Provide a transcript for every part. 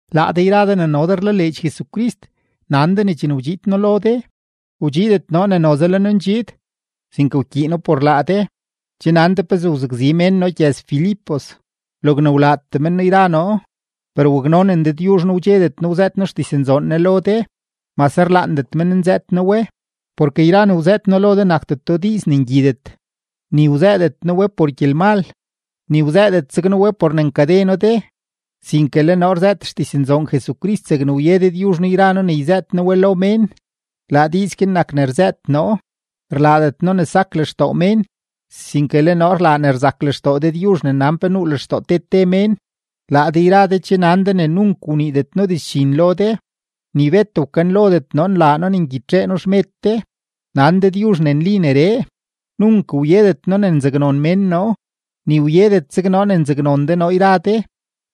Laa de yra de ne no de rlaleedx Jesucrist, nan de ne chene wdxiid noo lo de, wdxiidet noo ne noze le noo ndxiid, sinke wkyiino por laa de. Che nan de pezee wzakzi mén noo gyëz-Filipos, logne wlaatee men noo yra noo. Per waknonen Dëdyuzh noo wdxedet noo wzëët noo xdiznzoon Ne lo de, mase rlaandet mén nzëët noo we. Porke yra ne wzëët noo lo de nakdeto diiz ne ngyidet, ni wzëëdet noo we por gyelmal, ni wzëëdet zeg noo we por ne nkade noo de, sinke le noo rzëët xdiznzoon Jesucrist zegne wye Dëdyuzh noo yra noo ne yzëët noo we lo mén; laa diiz guin nak ne rzëët noo. Rlaadet noo ne sak lextoo mén, sinke le noo rlaa ne rzak lextoo Dëdyuzh ne nan pe nuu lextoo te te mén. Laa de yra de che nan de ne nunk wniidet noo dizdxin lo de, ni bet wkanlodet noo nlaa noo ne ngyitxee noo xmed de; nan Dëdyuzh ne nli neree. Nunk wyedet noo ne nzaknon mén noo, ni wyedet zeg noo ne nzaknon de noo yra de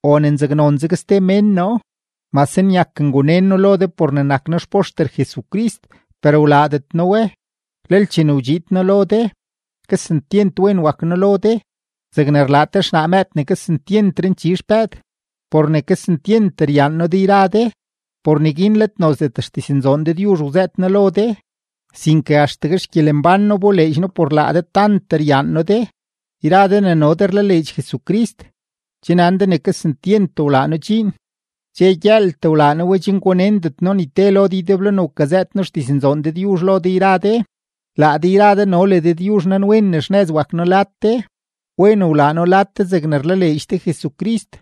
o ne nzaknon zeg ste mén noo. Mase nyak ngunen noo lo de por ne nak noo xpoxter Jesucrist, per wlaadet noo we. Lel chene wdxiid noo lo de, kesentyent wen wak noo lo de zegne rlaa te xnaa mëëd ne kesentyent ranchi xpëëd. Por ne kesentyent ryaan noo de yra de, por neguin let nozdet xdiznzoon Dëdyuzh wzëët noo lo de, sinke axtegue xgyelembán noo wboleedx noo por laa de tant ryaan noo de. Yra de ne no de rlaleedx Jesucrist, che nan de ne kesentyent wlaa noo dxiin, dxe gyëëltee wlaa noo we chen gunendet noo ni te lo de ydeblo ne wkazëët noo xdiznzoon Dëdyuzh lo de yra de. Laa de yra de no le Dëdyuzh nanwen ne xnëz wak noo lad de, wen wlaa noo lad de zegne rlaleedx de Jesucrist,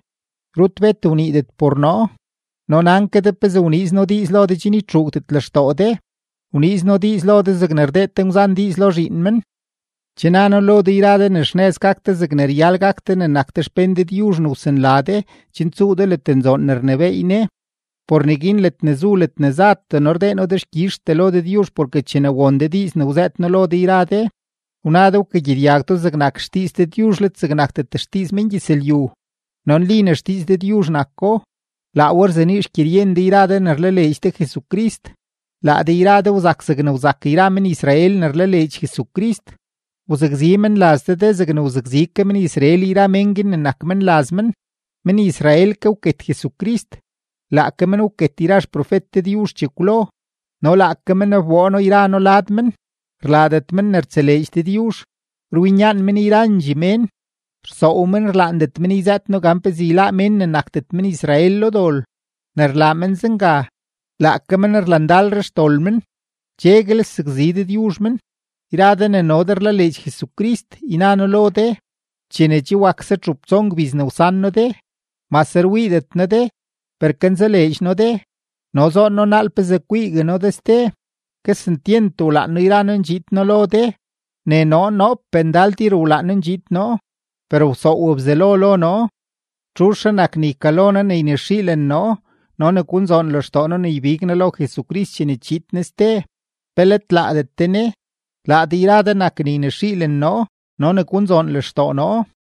rut bet wniidet por noo. No nan ke de pezee wniiz noo diiz lo de chen ytxuugdet lextoo de; wniiz noo diiz lo de zegne rdee te ngwzan diiz lo zhiin men. Che na noo lo de yra de ne xnëz gak de zegne ryal gak de ne nak de xpén Dëdyuzh ne wsanla de chen tsuu de ledne nzoon ne rnebééy Ne. Por neguin ledne zu ledne zatee noo rdee noo dexkyizhtee lo Dëdyuzh porke chene won de diiz ne wzëët noo lo de yra de, wna de wkagyedyag do zegnak xdiiz Dëdyuzh let zegnakdet xdiiz mengyëzlyu, no nli ne xdiiz Dëdyuzh nako. Laa we rzenii xgyeryen de yra de ne rlaleedx Jesucrist. Laa de yra de wzak zegne wzak yra men-Israel ne rlaleedx Jesucrist. Wzakzi menlaz de de zegne wzakzi ke men-Israel yra mén guin ne nak menlaz men. Men-Israel ke wket Jesucrist, laake men wket yra xprofet Dëdyuzh chekwlo, no laake men wboo noo yra noo lad men. Rlaadet men ne rtseleedx Dëdyuzh, rwinyaan men yrandxee mén. Rsoow men rlaandet men yzëët noo gan pezee yláá mén ne nakdet men-Israel lo dol. Ne rlaa men zenga, laake men rlandalre xdol men; cheguel sakzi Dëdyuzh men. Yra de ne no de rlaleedx Jesucrist, yna noo lo de, chene che wakse txup tson gbiz ne wsan noo de, mase rwiidet noo de, per kanzaleedx noo de no zoon noo naal pezee kwiigue noo de ste. Kesentyent wlaan noo yra noo ndxiid noo lo de, ne noo noopee ndal tir wlaan noo ndxiid noo, per wsoow Bzelo lo noo. ¿Txuzhre nak ne ykalo noo ne ynexiilen noo no ne gunzoon lextoo noo ne ybig noo lo Jesucrist chene chiid Ne ste? ¿Pe let laadet de ne? Laa de yra de nak ne ynexiilen noo no ne gunzoon lextoo noo.